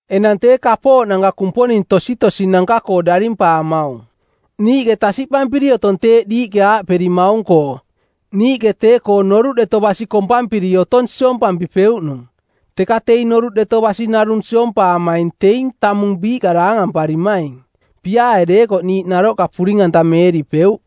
Enang tee kapooꞌnanka kumponing tositosinanka-koo darimpaamaung: Niiꞌke tasiꞌpampiri otong teeꞌ diiꞌke aaꞌperimaung-koo, “Niiꞌke tee-koo noruꞌ deto basi kompampiri otong siompampipeuꞌnung.” Teka teing noruꞌ deto basi narung siompaamaing teing tamung biiꞌka daangamparimaing. Piaae deekoꞌ niiꞌ naroꞌka puring-antameeripeuꞌ.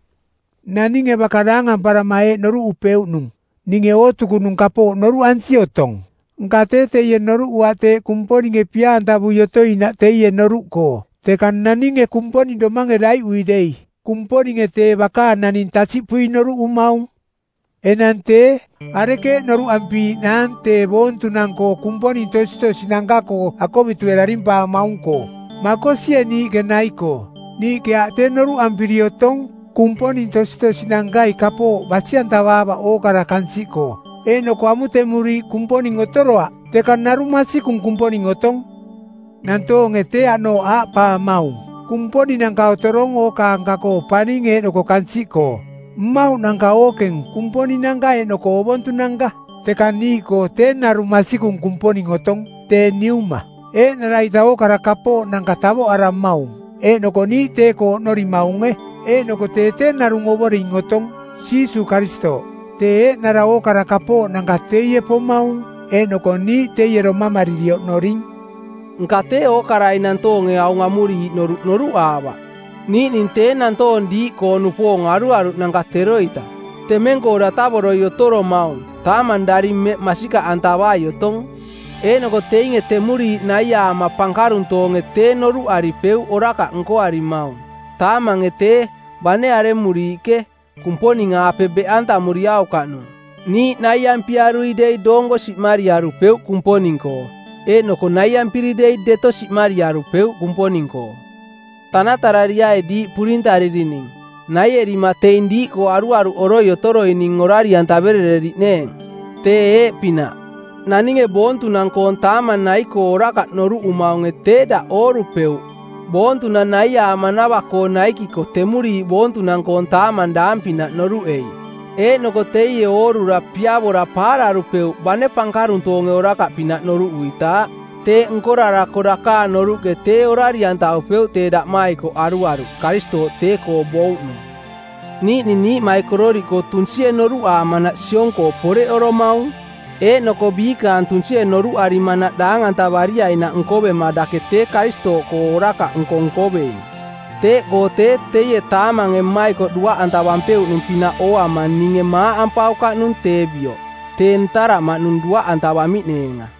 Naninge baka daangamparama eeꞌ noruꞌupeuꞌnung: “Ninge ootukunung kapooꞌ noruꞌansi otong.” Nka tee teie noruꞌuaꞌ teeꞌ Kumponinge pia-antavui otoinaꞌ teie noruꞌkoo. Teka naninge Kumponing domange daiꞌui dei Kumponinge tee bakaang naning tasiꞌpui noruꞌumaung. Enang tee, arekeeꞌ noruꞌampiiꞌnaang tee boontunang-koo Kumponing tositosinanka-koo akovitue darimpaamaung-koo? Makosie niiꞌke nai-koo? Niiꞌke aaꞌ tee noruꞌampiri otong kumponing tositosinankai kapooꞌ basi-antavaavaꞌ ookara kansiꞌkoo, eeꞌnoko amutemuriiꞌ kumponing otoroaꞌ, teka narung masikung Kumponing otong. Nantoonge tee, aꞌnooꞌ aaꞌpaamaung: Kumponinanka otorong ookaanka-koo paning eeꞌnoko kansiꞌkoo, mmauꞌnanka ookeng kumponinanka eeꞌnoko ovontunanka. Teka niiꞌkoo tee narung masikung Kumponing otong, tee Niuma. Eeꞌnara-ita ookara kapooꞌnanka tavoꞌaramaung, eeꞌnoko niiꞌ tee-koo oꞌnorimaunge. Eeꞌnoko tee tee narung Ovoring otong, Jiisuuꞌ Karistooꞌ. Tee eeꞌnara ookara kapooꞌnanka teie pomaung eeꞌnoko niiꞌ teie domamariri oꞌnoring. Nka tee ookarai nantoonge aung amuriiꞌ noruꞌ noruꞌaavaꞌ. Niiꞌning tee nantoong diiꞌkoo-nupoong aruaruꞌnanka teroita, temeng-koo datavoroi otoromaung, taamang daring mmeꞌ masikaꞌantavai otong. Eeꞌnoko teinge temuriiꞌ naiaama pankaruntoonge tee noruꞌaripeuꞌ orakaꞌ nkoarimaung. Taamange tee, bane aremuriiꞌke, Kumponing-aape beꞌantamuriaukaꞌnung. Niiꞌ naiampiarui dei doonko siꞌmariarupeuꞌ Kumponing-koo. Eeꞌnoko naiampiri dei deto siꞌmariarupeuꞌ Kumponing-koo. Tanatarariai diiꞌ purintaririning, naierima teing diiꞌkoo aruaruꞌoroi otoroining orari-antaverereriꞌneeng. Tee eeꞌpinaꞌ: Naninge boontunang-koong taamang nai-koo orakaꞌ noruꞌumaunge tee daꞌ oorupeuꞌ boontunang naiaamanava-koo naikiko temuriiꞌ boontunang-koong taamang daang pinaꞌ noruꞌei. Eeꞌnoko teie oorura piavora paararupeuꞌ bane pankaruntoonge orakaꞌpinaꞌ noruꞌuitaaꞌ. Teeꞌ nkorarako dakaang noruꞌke tee orari-antavupeuꞌ tee daꞌmaikoꞌ aruaruꞌ, Karistooꞌ tee-koo bouꞌnung. Niiꞌning niiꞌmaikororiꞌkoo tunsie noruꞌarimanaꞌ siong-koo poreꞌoromaung, eeꞌnoko biikaang tunsie noruꞌarimanaꞌ daang-antavariainaꞌ nkoverima dake tee Karistooꞌkoo orakaꞌnko nkoveing. Teeꞌkoo tee teie taamange mmaikoꞌ duaꞌantavupeuꞌnung-pinaꞌ ooama ninge maaꞌ ampaukaꞌnung tee bioꞌ, tee ntaraꞌmaꞌnung duaꞌantavamiꞌneenga.